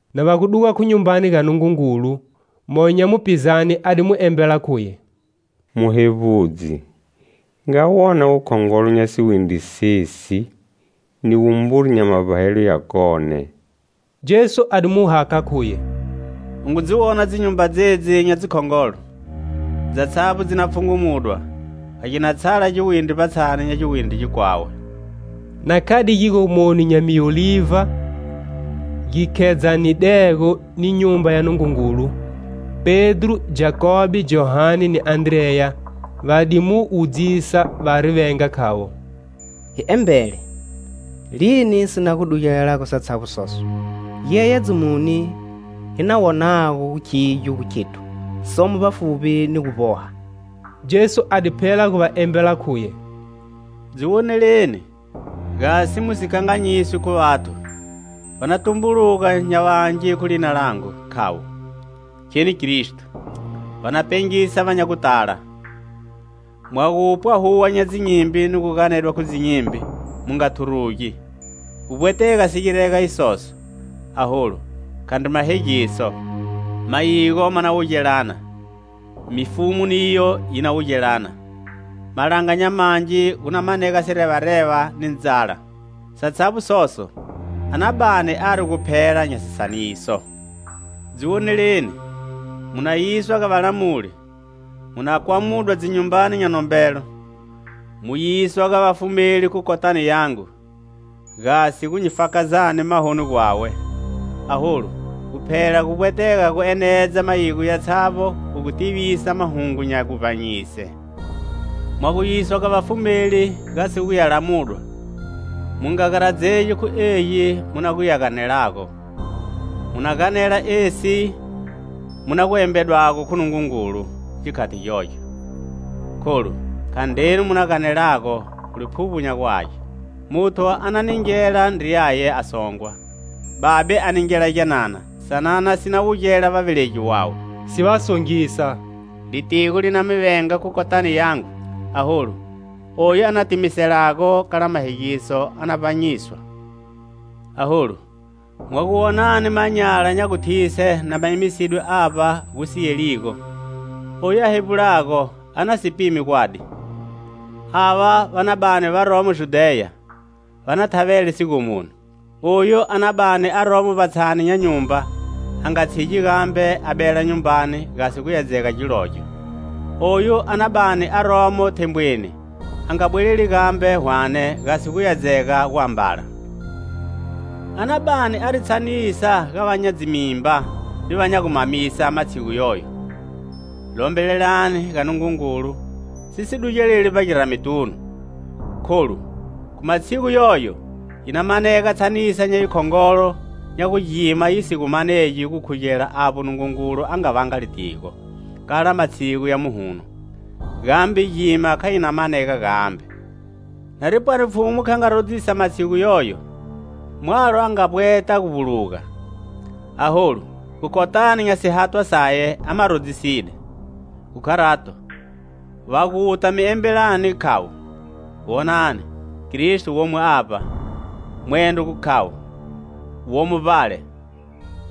Na va gu duga khu Nyumbani ga Nungungulu, moyo nya mupizane a di mu embela khuye: "Muhevbudzi, nga wona wukhongolo nya siwindri sesi ni wumburi nya mavbahelo yakone!" Jesu a di mu hakha khuye: "U ngu dzi wona dzinyumba dzedzi nya dzikhongolo? Dzatshavbo dzi na pfhungumudwa. Kha gina tshala giwindri vbatshani nya giwindri gikwawe." Na khade gigomoni nya miolivha gi khedzanidego ni Nyumba ya Nungungulu, Pedro, Jakobe, Johane ni Andreya va di mu wudzisa vari venga khavo: "Hi embele, lini si na gu dugelelago satshavbo soso? Giyeyedzo muni hi na wonago khigyo gu khethu somo vbafuvbi ni gu vboha?" Jesu a di phela gu va embela khuye: "Dzi woneleni, gasi mu si kanganyiswi khu vathu. Va na tumbuluga nya vangi khu lina langu, khavo: 'Kheni Kristo.' Va na pengisa va nya gutala. Mwa gupwa huwa nya dzinyimbi ni gu ganedwa khu dzinyimbi mu nga thurugi; gu vbwetega si girega isoso, aholu khandri mahegiso. Mayigo ma na wugelana, mifumu niyo yi na wugelana; malanga nya mangi gu na manega sirevareva ni ndzala. Satshavbo soso a na bani ari guphela nya sisaniso. "Dzi woneleni. Mu na yiswa ga valamuli, mu na kwamudwa dzinyumbani nya nombelo, mu yiswa ga vafumeli khu kotani yangu, gasi gu nyi fakazani mahoni gwawe. Aholu, guphela gu vbwetega gu enedza mayigo yatshavbo khu gu tivisa mahungu nya guvbanyise. Mwa gu yiswa ga vafumeli gasi gu ya lamudwa mu nga garadzegi khu egi mu na gu ya ganelago. Mu na ganela esi mu na gu embedwago khu Nungungulu gikhati gyogyo. Kholu, khandrenu mu na ganelago, khu Liphuvbo nya gu Age. Muthu a na ningela ndriyaye a songwa, babe a ningela gyanana; sanana si na wugela vavelegi vawe, si va songisa Litigo li na mi venga khu kotani yangu. Aholu oyu a na timiselago kala mahegiso a na vbanyiswa. "Aholu, mwa gu wonani manyala nya guthise na ma emisidwe avba gu si yeligo - oyu a hevbulago a na si pime gwadi - ava va na bani varomo Judheya, va na thavele sigomoni. Oyu a na bani aromo vbatshani nya nyumba a nga tshigi gambe a bela nyumbani gasi guya dzega gilogyo. Oyu a na bani aromo thembweni a nga bweleli gambe hwane gasi guya dzega guambala. A na bani ari tshanisa ga va nya dzimimba ni va nya gu mamisa matshigu yoyo. Lombelelani ga Nungungulu, si si dugeleli vbagirametunu Kholu khu matshigu yoyo yi na manega tshanisa nya yikhongolo nya gu gima yi si gu manegi gukhugela avbo Nungungulu a nga vanga litigo, kala matshigu ya muhuno, gambe gima kha yi na manega gambe. Nari pwani Pfhumu kha nga rodzisa matshigu yoyo, mwalo a nga vbweta gu vbuluga; aholu, kotani nya sihathwa saye a ma rodziside. Khu kharato, va guta mi embelani khavo: 'Wonani, Kristo womo avba,' mwendro gu khavo: 'Womo vbale,'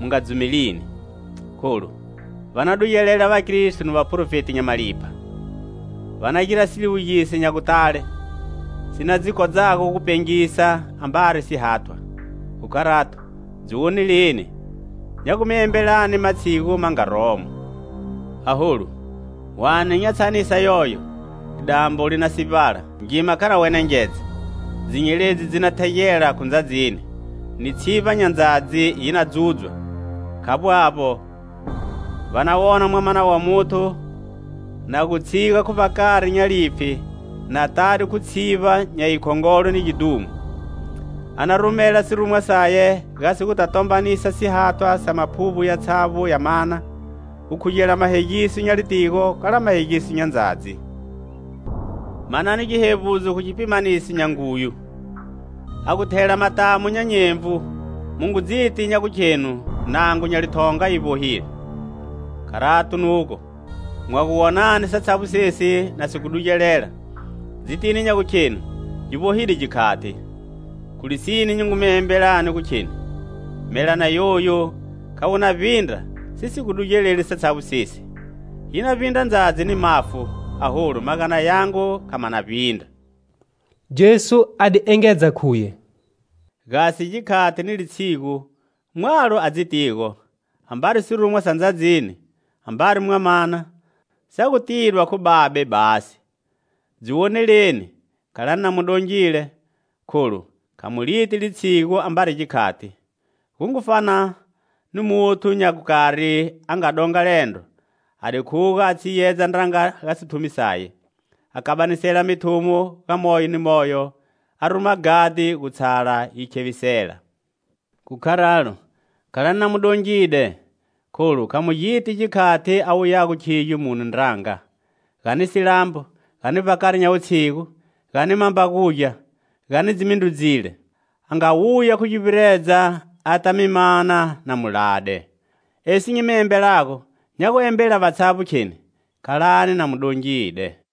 mu nga dzumelini. Kholu va na dugelela vakristo ni vaprofeti nya malipha. Va na gira siliwugiso nya gutale, si na dzi kodzago gu pengisa ambari sihathwa. Khu kharato, dzi woneleni, nya gu mi embelani matshigu ma nga romo. "Aholu, hwane nya tshanisa yoyo, lidambo li na sivbala, ngima kha na wenengedza. Dzinyeledzi dzi na thegela khu ndzadzini ni tshivba nya ndzadzi yi na dzudzwa. Khavbo avbo, va na wona Mwamana wa Muthu na gu tshiga khu vbakari nya lipfhi na tade khu tshivba nya yi khongolo ni gidhumo. A na rumela sirumwa saye gasi guta tombanisa sihathwa sa maphuvbo yatshavbo ya mana, gukhugela mahegiso nya litigo kala mahegiso nya ndzadzi. "Manani gihevbudzo khu gipimaniso nya nguyu: a gu thela matamu nya nyenvu mu ngu dziti nya gukhenu nango nya lithonga yi vbohile. Kharato nugo, mwa gu wonani satshavbo sesi na si gu dugelela, dzitini nya gukhenu gi vbohile gikhati. Khu lisine, nyi ngu mi embelani gu kheni: Melana yoyu kha wu na vbindra si si gu dugeleli satshavbo sesi. Yi na vbindra ndzadzi ni mafu, aholu magana yangu kha ma na vbindra." Jesu a di engedza khuye: "Gasi gikhati ni litshigu mwalo a dzitigo, ambari sirumwa sa ndzadzini, ambari Mwamana, sa gu tidwa khu Babe basi. Dzi woneleni, khalani na mu dongile, kholu kha mu liti litshigu ambari gikhati. Gu ngu fana ni muthu nya gukari a nga donga liendro, a di khuga a tshiyedza ndranga ga sithumi saye, a kabanisela mithumo ga moyo ni moyo, a ruma ghadhi gu tshala yi khevisela. Khu kharalo, khalani na mu dongide kholu kha mu giti gikhati a wuyago khigyo mune ndranga, gani silambo, gani vbakari nya wutshigu, gani mambagugya, gani dzimindrudzile; a nga wuya khu guvbiredza ata mi mana na mu lade. Esi nyi mi embelago nya gu embela vatshavbo kheni: Khalani na mu dongide."